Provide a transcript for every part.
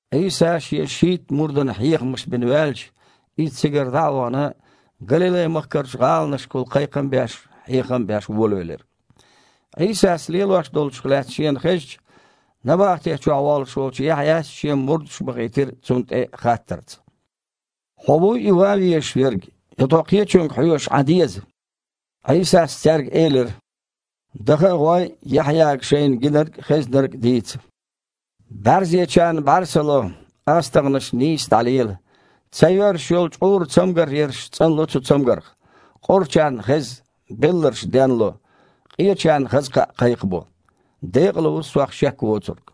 Іийса Шен шийтта мурдана хьехамаш бина ваьлча, Иза цигара дІа а вахана, Галилай-махкарчу гІаланашкахула кхайкхам а беш, хьехам а беш волавелира. Іийсас лелош долчух лаьцна шена хезча, набахти чохь воллуш волчу Яхьъяс шен мурдаш бахийтира Цунна тІе хаттарца: «Хьо вуй и ван везаш верг, я тхо кхечуьнга хьоьжуш Іан деза?» Іийсас цаьрга элира: «Даха а гІой, Яхьъяга шайна гинарг а, хезнарг а дийца: бІаьрзечарна бІаьрса ло, астагІнаш нийса дІалела, ца йоьрзуш йолу чкъуран цамгар ерш цІанло цу цамгарх, къорачарна хеза, белларш денло, къечарна хаза кхаъ кхайкхабо. Декъала ву Сох шек воцург».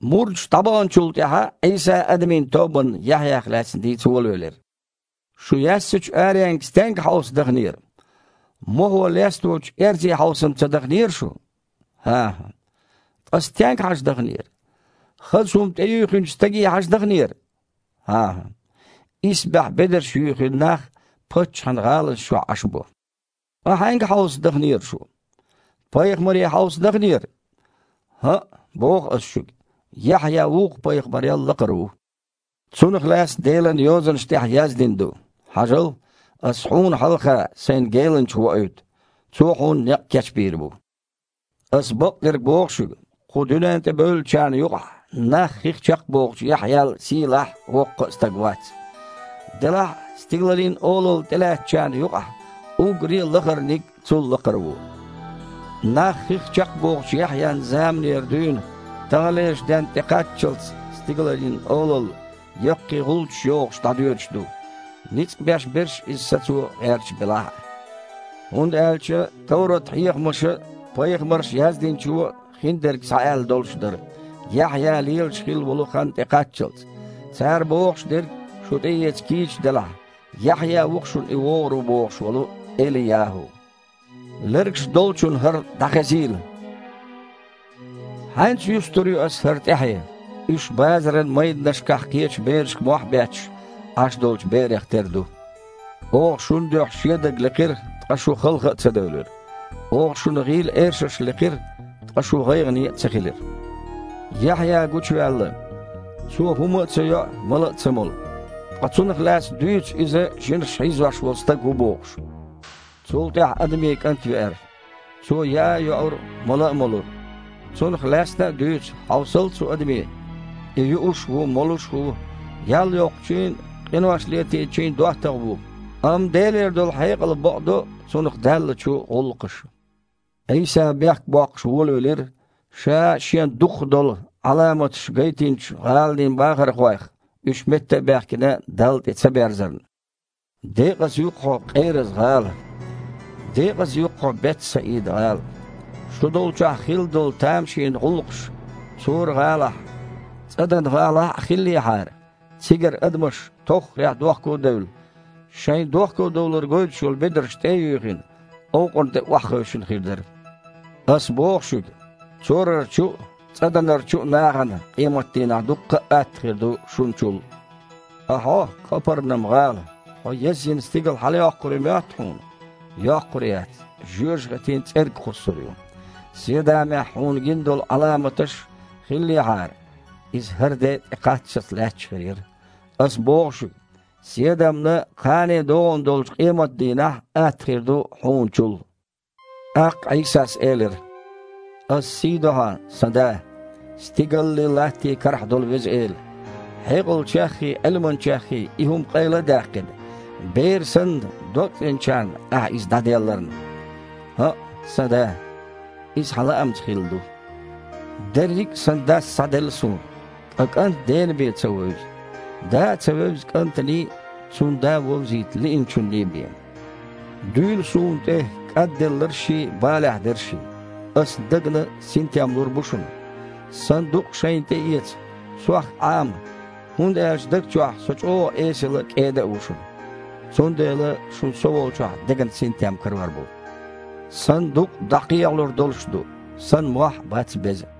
Мурдаш дІабахначул тІаьхьа Іийса адамийн тобанна Яхьъях лаьцна дийца волавелира: «Шу яьссачу аренга стенга хьовса даханера? Мохо лесточу эрзе хьовса-м ца даханера шу? ХІан-хІа. Ткъа стенга хьажа даханера? Хаза хІума тІеюьйхинчу стаге хьажа дахнера? ХІан-хІа. Исбаьхьа бедарш юьйхина нах паччахьан гІаланаш чохь Іаш бу. Ткъа хьаьнга хьовса дахнера шу? Пайхамаре хьовса дахнера? ХІаъ, боху Аса шуьга. Яхьъя вукху пайхамарел лакхара ву. Цунах лаьцна Делан Йозанаш тІехь яздина ду: „Хьажал! Ас Хьуна хьалха Сайн геланча воуьйту. Цо Хьуна некъ кечбийр бу!“ Аса бакъдерг боху шуьга: кху дуьнен тІе бевллачарна юкъахь нах хих чекхбохучу Яхьъял сийлахь а, воккха а стаг вац. Делахь а стигалийн Олалла тІелаьцначарна юкъахь уггаре а лахарниг а цул лакхара ву. Нах хих чекхбохучу Яхьъян заманера дуьйна таханлерчу денна тІе кхаччалц стигалийн Олалла, яккхий гІулчаш йохуш, дІадоьдуш ду, ницкъ беш берш иза сацо гІерташ белахь а. ХІунда аьлча товрат-хьехамаша а, пайхамарша яздинчо а хиндерг схьааьлла долуш дара, Яхьъя лелаш хилла волу хан тІекхаччалц. Цара бохуш дерг шу тІеэца кийча делахь, Яхьъя ву-кх шуна и вогІур ву бохуш волу ЭлияхІу. Лергаш долчунна хІара дІахезийла. Хьаьнца юстур ю Аса хІара тІаьхье? Уьш, базаран майданашкахь кхечу берашка мохь а бетташ, Іаш долчу берех тера ду: „Оха шун дуьхьа шедаг лекхира, ткъа шу халха а ца девлира! Оха шуна гІийла эшарш лекхира, ткъа шу гІайгІане а ца хилира!“ Яхьъя гучуваьлла. Цо хІума а ца йоу, мала а ца молу. Ткъа цунах лаьцна дуьйцу, иза жинаша хьийзош волу стаг ву бохуш. Цул тІаьхьа Адамийн КІант веара. Цо яа а йоура, мала а молура. Цунах лаьцна а дуьйцу: „Хьовсал цу адаме! И юуш ву, молуш ву, ял йоккхучийн а, къинош летийначийн а доттагІа ву!“ Амма Делера долу хьекъал бакъдо цунах даьллачу гІуллакхаша». Іийса бехк боккхуш волавелира Ша Шен дукхах долу Іаламаташ гайтинчу гІаланийн бахархойх, уьш метта а баьхкина, Далла тІе ца берзарна. «Декъаза ю-кх хьо, Къераз-гІала! Декъаза ю-кх хьо, Бет-Саида-гІала! Шу долчохь хилла долу тамашийна гІуллакхаш Цора-гІалахь а, ЦІадан-гІалахь а хиллехьара, цигара адамаш, тоххарехь дохко а девлла, шайн дохкодовлар гойтуш йолу бедарш тІе а юьйхина, овкъарна тІе охьахевшина хир дара. Аса боху шуьга: Цорарчу а, ЦІаданарчу а нахана къематан дийнахь дуккха а атта хир ду шуначул. Ткъа хьо, Къапарнам-гІала, хьо язйина стигала хьалайоккхур ю моьтту хьуна? Йоккхур яц, жоьжахатин цІерга кхуссур ю. Седамехь хьуна гина долу Іаламаташ хиллехьара, иза хІара де тІекхаччалц лаьтташ хир яра. Аса боху шуьга: Седамна кхана догІун долчу къематан дийнахь атта хир ду хьуна чул». ТІаккха Іийсас элира: «Аса сий до Хьан, Сан Да, стигаллий, латтий карахь долу Веза Эла, хьекъалчеххий, Іилманчеххий и хІума къайла а даьккхина, бер санна, догцІеначарна Ахьа иза дІаделларна. ХІаъ, Сан Да, иза Хьан лаамца хилла ду. Дерриг а Сан Дас схьаделла Суна, ткъа КІант Дена бен ца вевза. Да а ца вевза КІантаний, Цунна Да вовзийта лиъначунний бен. Дуьйла Суна тІе, кІадделларшший, балехь дершший. Аса дагна синтем лур бу шуна. Сан дукъ шайна тІеэца, Сох Іама, хІунда аьлча даг чохь Со чІогІа эсала а, кІеда а ву шуна. Цундела шуна Со волчохь деган синтем карор бу. Сан дукъ а дІакхехьалур долуш ду, Сан мохь а бац беза».